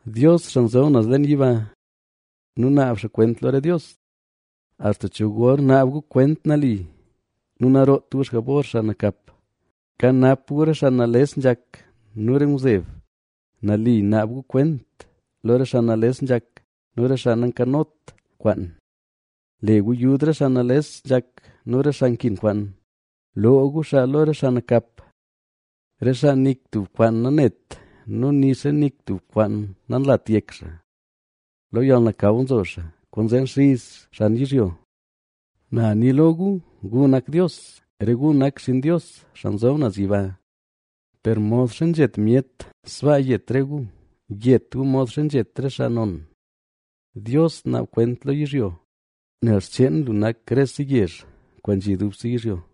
Dios, xaa nzob naz leen yiba nu naab xaa kwent lo re dios. ¿Axta cho gor naab gu kwent nali nu naroot gu xjabor xaa nakap? Kanap gu re xaa nales nzhak nu re ngwzeb, nali naab gu kwent lo re xaa nales nzhak nu re xaa nankanot kwaan. Le gu yud re xaa nales nzhak nu re xaa nkin kwaan; loo gu xaa lo re xaa nakap. Re xaa nik tub kwaan nanet nu nixa nik tub kwaan nanlat yek xaa, lo yalnakaw nzo xaa, kwaanzee nxiz xan yizhyo. Na ni lo gu: “Gu nak dios, re gu nak xinn Dios, Xaa Nzob Naz Yiba. Per modxa nzhet myet sbaa yet re gu, yet gu modxa nzhet re xaa non.” Dios, naab kwent lo yizhyo, nel xcheen lu nak rese yezh kwaan nzhi dubse yizhyo.